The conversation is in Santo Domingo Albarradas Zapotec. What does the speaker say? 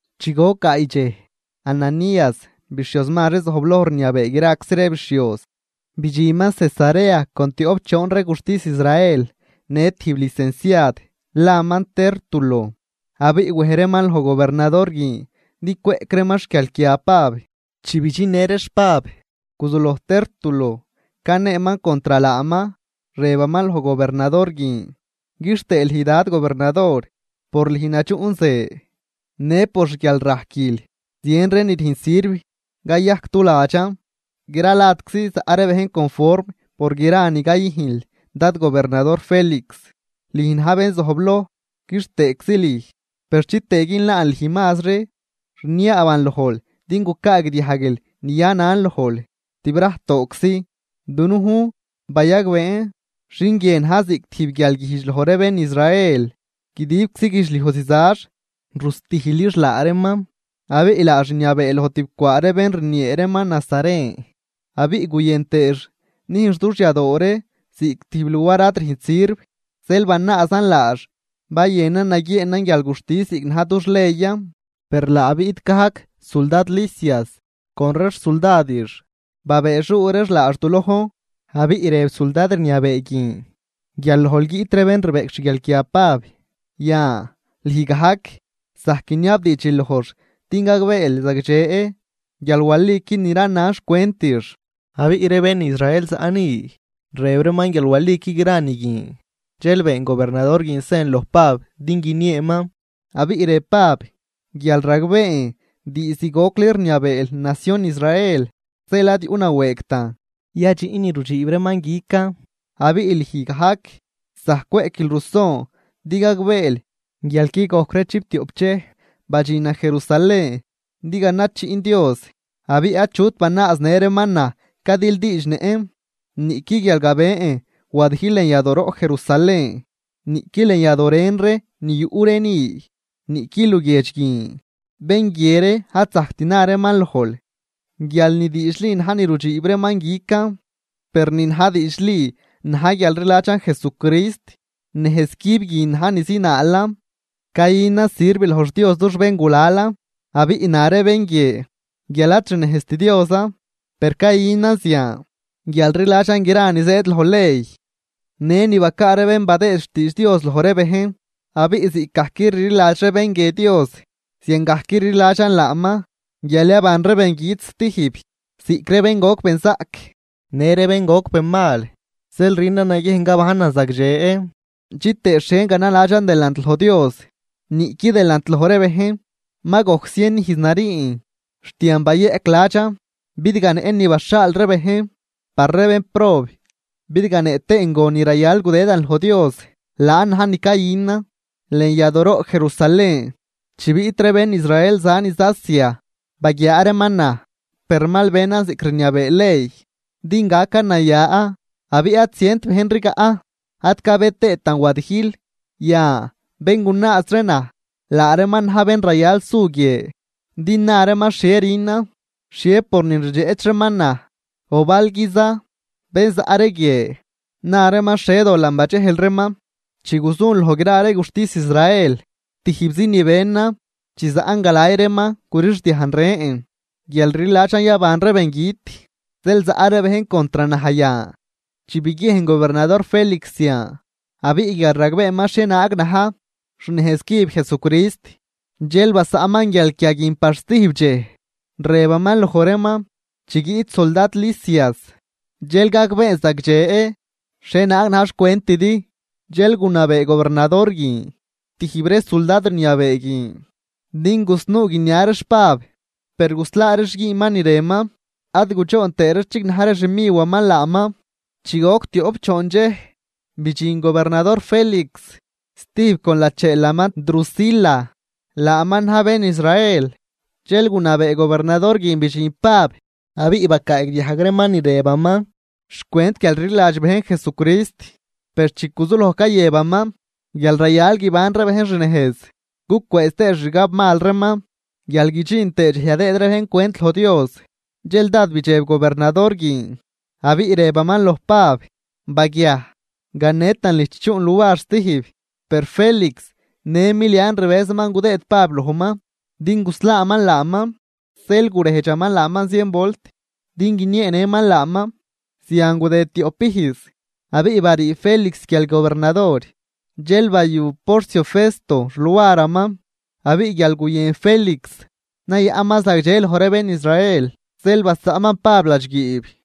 Chi goc gaay dxej, Ananías, bixhioz mazri zojbloj rniabee graczi ree bixhioz, bidxinman Cesarea con tioꞌp choon ree guxtis Israel në tijb licenciad laman Tértulo. Abiꞌ wej reeman loj gobernador guin din cweꞌc reeman xguialquia Pab. Chi bidxinnë reex Pab, guzuloj Tértulo caneeman contr laaman, rëbaman loj gobernador guin: ―Quixtëë lüj dad gobernador, por lüj nadxuꞌdxen, në por xguialrajquil zien ree ni rüjn sirv cayajc du ladxan. Gra ladczi zaꞌ ree bejn conform por gra ni cayüjnl dad gobernador Félix, lüj na̱j bén zojbloj, quixtëëczi lüj. Per chitëë günlaan lüj mazri, rniaaban lojl din gucaagdiajguil ni yanan lojl tibrajtooczi. Dunujn bayagbeen xin guie na̱j ziꞌc tijb guialguijdx loj ree bén Israel, guidibczi guidxliuj zizax rustijlix laa reeman abiꞌ laax rniabee loj tib cwaa ree bén rniee reeman nazaren. Abiꞌ guyën tëëx nüjnx dux yadooroꞌn ziꞌc tijb luar ad rüjnt sirv, zeel banaazan laax bayënan naguieenan guialguxtis ziꞌc na̱j dux leyan. Per laa biꞌt gajc suldad Lisias con ree xsuldadix, babëëxuu reex laax du lojn. Abiꞌ rëb suldad rniabee guin guial lojl guiꞌt ree bén rbeꞌc xguialquia Pab, yan lüj gajc zajc guiniabdiidx lojx din gagbeel zagdxe guial walican ni ranan xcwentix. Abiꞌ ree bén Israel zaꞌ ni rëb reeman guial waliqui gra ni guin. Dxel been gobernador guin sen loj Pab din guinieeman, abiꞌ rëb Pab: ―Guial ragbeen diizd gocli rniabeel nacion Israel, zeel ad yuꞌnawëëgtan yadxiꞌn ni rudxiib reeman guican. Abiꞌ lüj gajc zajc cweꞌquil ruson din gagbeel guial qui gojcri chiptioꞌp dxej badxinan Jerusalén din ganajchiꞌn Dios. Abiꞌ achut banaaznë reeman naj cadildiidxnëꞌn, niꞌqui guial gabën wadijl lën yadooroꞌ Jerusalén, niꞌqui lën yadoo ren ree ni yuꞌ ree ni, niꞌqui luguiedx guin. Bén guie ree ad zajct na reeman lojl guial ni diidxli na̱j ni rudxiib reeman guican. Per ni na̱j diidxli na̱j guial rliladxan Jesucrist, nejzcüb guin na̱j ni zinaalan, cayünan sirv loj xDios dux béngulalan, abiꞌ na ree bén guie guial ad xnejzt Diosan, per cayünan zian guial rliladxan gra ni zëëd loj ley në ni bacaa ree bén badëëd xtiidx Dios loj ree bejn. Abiꞌ ziꞌcgajc rliladx ree bén guie Dios, ziangajc rliladxan laaman guial yaban ree bengüt stijb, ziꞌc ree bén goc benzaꞌc në ree bén goc benmal. Zeel rünan naguiejn gabajnan zagdxe chitëë xhie ganaladxan delant loj Dios niꞌqui delant loj ree bejn. ’Ma gojc zien ijz nariin, xt yan bayeꞌc ladxan bidganëꞌn ni baxhaal ree bejn par ree bénprob, bidganëꞌ tëën gon ni rayal gudëdan loj Dios. Laan na̱j ni cayünan lën yadooroꞌ Jerusalén chi biꞌt ree bén Israel za niz Asia baguiaa reeman naj, per mal benan ziꞌc rniabee ley din gacan naya. Abiꞌ ad zient bejn rigaꞌ, ad cabë tëëtan wadijl. Yan, bén gunaaz ree naj, laa reeman na̱j bén rayal su guie din na reeman xhie rünan xhie pornin rdxeꞌch reeman naj. O balguiza, bén zaꞌ ree guie na reeman xhie da dolan badxejl reeman chi guzun loj gra ree guxtis Israel. Tijbzi ni benan chi zaꞌn galay reeman gurixdiajn rën: “Guial rliladxan yaban ree bengüt, zeel zaꞌ ree bejn contr naj yan.” Chi biguiejn gobernador Félix zian, abiꞌ guial ragbeeman xhienaag na̱j xnejz cüb Jesucrist, dxel basaꞌnman guialquia guin par stijb dxej, rëbaman loj reeman: ―Chi guiꞌt suldad Lisias, dxel gagbeen zagdxe xhienaag na̱j xcwentidi. Dxel gunabee gobernador guin tijb ree suldad rniabee guin din gusnuu guinia reex Pab, per guslaa reex güünman ni rënman ad gudxoon tëë reex chignaj ree xmiwaman laaman. Chi goc tioꞌp choon dxej, bidxin gobernador Félix stijb con lacheelaman Drusila, laaman na̱j bén Israel. Dxel gunabee gobernador guin bidxin Pab, abiꞌ bacaagdiajg reeman ni rëbaman xcwent guialrliladx bejn Jesucrist. Per chi guzuloj cayëbaman guial rayal guiban ree bejn xnejz, gucwëëz tëë xixgab mal reeman, guial guidxin tëë dxej yadëëd ree bejn cwent loj Dios, dxel dád bidxeb gobernador guin abiꞌ rëbaman loj Pab: ―Baguiaj. Ganetan lüj chi chuꞌn luar stijb. Per Félix në milian rbëzaman gudëëd Pab lojman din guslaaman laaman, zeel gurejdxaman laaman zien volt din guinieenëman laaman. Zian gudëd tioꞌp ijz abiꞌ barii Félix guial gobernador, dxel bayu Porcio Festo xluaraman. Abiꞌ guial guyën Félix nayaꞌnman zagdxe loj ree bén Israel, zeel basaꞌnman Pab ladxguiib.